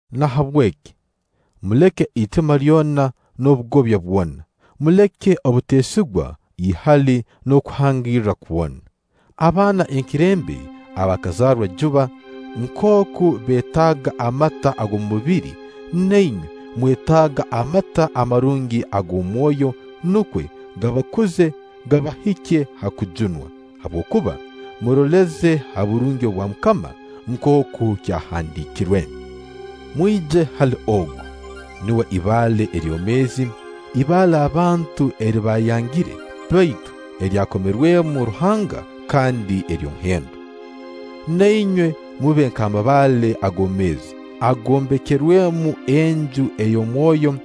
Nahabweki, muleke itima lyona n'obugobya bwona, muleke obuteesigwa, ihali n'okuhangirra kwona. Abaana enkerembe abaakazarwa juba nkooku beetaaga amata ag'omubiri, na inywe mwetaaga amata amarungi ag'omwoyo, nukwo gabakuze, gabahikye ha kujunwa; habwokuba “Muroleze ha burungi bwa MUKAMA”, nkooku kyahandiikirwe. Mwije hali ogu. Nuwe ibaale eryomeezi, ibaale abantu eri baayangire; baitu eryakomerwemu Ruhanga kandi ery'omuhendo. Na inywe mube nk'amabaale agoomeezi, agombekerwemu enju ey'omwoyo,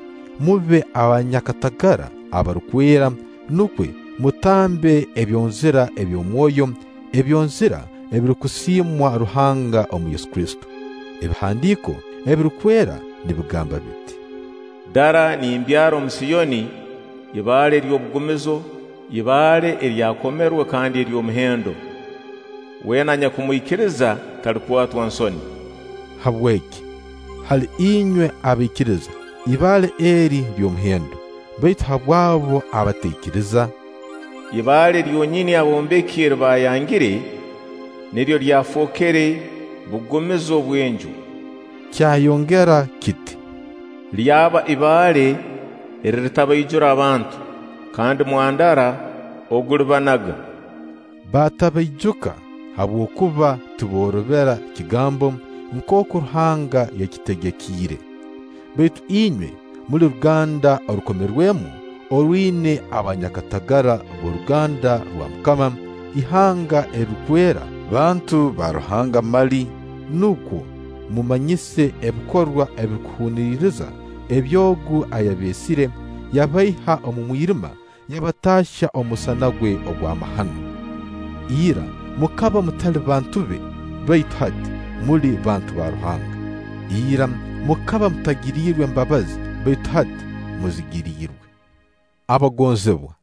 mube abanyakatagara abarukwera, nukwo mutambe ebyonzira eby'omwoyo, ebyonzira ebirukusiimwa Ruhanga omu Yesu Kristo. Ebihandiiko Ebirukwera nibigamba biti: “Dara, nimbyara omu Siyoni ibaale ery'obugumizo, ibaale eryakomerwe kandi ery'omuhendo. Weena anyakumwikiriza, talikwatwa nsoni.” Habweki, hali inywe abaikiriza, ibaale eri, ly'omuhendo; baitu habw'abo abataikiriza: “Ibaale lyonyini abombeki eri baayangire, niryo lyafookere bugumizo bw'enju.” Kyayongera kiti: “Lyaba ibaale eriritabaijura abantu, kandi mwandara ogulibanaga”; batabaijuka habwokuba tiboorobera kigambo, nkooku Ruhanga yakibategekiire. Baitu inywe muli ruganda orukomerwemu, orwina abanyakatagara b'oruganda rwa MUKAMA, ihanga erirukwera, bantu ba Ruhanga mali, nukwo mumanyise ebikorwa ebirukuhuniriza eby'Ogu ayabeesire, yabaiha omu mwirima yabataahya omu musana gwe ogw'amahano. Ira mukaba mutali bantu be, baitu hati muli bantu ba Ruhanga. ira mukaba mutagiriirwe mbabazi, baitu hati muzigiriirwe. Abagonzibwa,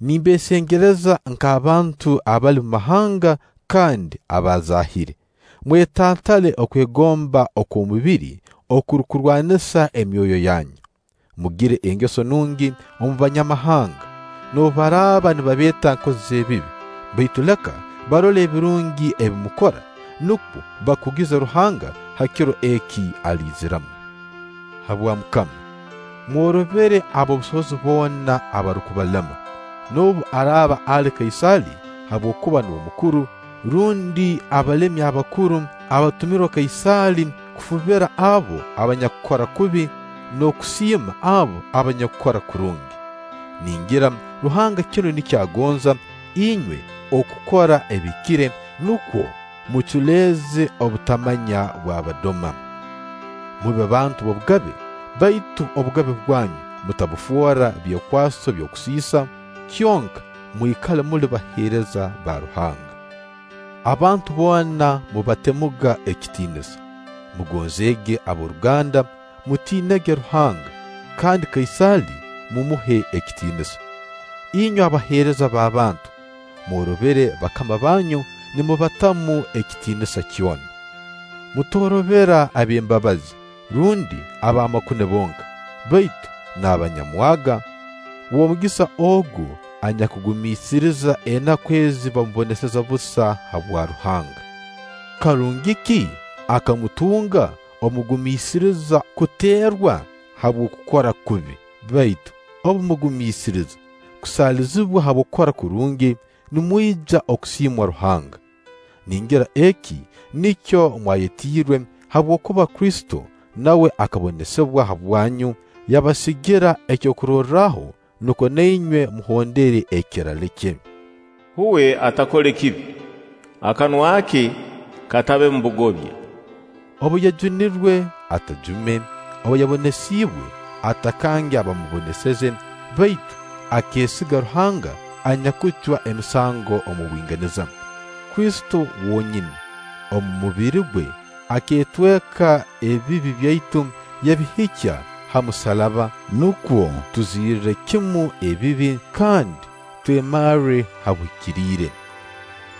nimbeesengereza nk'abantu abali mu mahanga kandi abaazaahire, mwetantale okwegomba okw'omubiri okurukurwanisa emyoyo yanyu. Mugire engeso nungi omu Banyamahanga, noobu baraaba nibabeeta nkozi z'ebibi, baitu leka barole ebirungi ebi mukora, nukwo bakugize Ruhanga ha kiro eki aliiziramu. Habwa MUKAMA, mworobere ab'obusobozi boona abarukubalema, noobu araaba ali Kaisaali, habwokuba nuwe mukuru, rundi abalemi abakuru abatumirwe Kaisaali kufubira abo abanyakukora kubi, n'okusiima abo abanyakukora kurungi. Ningira Ruhanga kinu nikyo agonza, inywe okukora ebihikire, nukwo muculeeze obutamanya bw'abadoma. Mube bantu b'obugabe, baitu obugabe bwanyu mutabufoora byekwaso by'okusiisa; kyonka mwikale muli baheereza ba Ruhanga. Abantu boona mubatemuga ekitiinisa. Mugonzeege ab'oruganda. mutiinege Ruhanga. Kandi Kaisaali mumuhe ekitiinisa. Inywe abaheereza b'abantu, mworobere bakama banyu nimubatamu ekitiinisa kyona. Mutoorobera ab'embabazi rundi ab'amakune bonka, baitu n'abanyamwaga. W'omugisa ogu anyakugumiisiriza enaku ezi bamuboneseza busa habwa Ruhanga. Karungi ki aka mutunga obu mugumiisiriza kuteerwa habw'okukora kubi? Baitu obu mugumiisiriza kusaalizibwa habw'okukora kurungi, nimwija kusiimwa Ruhanga. Ningira eki nikyo mwayetiirwe, habwokuba Kristo nawe akabonesibwa habwanyu, yabasigira ekyokurorraho, nukwo na inywe muhondere ekirale kye. Uwe atakole kibi; akanwa ke katabemu bugobya. Obu yajumirwe, atajume; obu yabonesiibwe, atakange abaamuboneseze; baitu akeesiga Ruhanga anyakucwa emisango omu bwinganiza. Kristo wonyini, omu mubiri gwe akeetweka ebibi byaitu yabihikya ha musaraba, nukwo tuzirre kimu ekibi, kandi twemarre ha buhikiriire.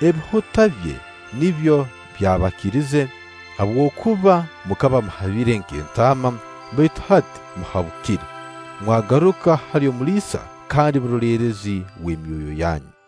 Ebihuta bye nibyo byabakirize. Habwokuba mukaba muhabire nk'entaama, baitu hati muhabukire, mwagaruka hali Omuliisa kandi Omuroleerezi w'emyoyo yanyu.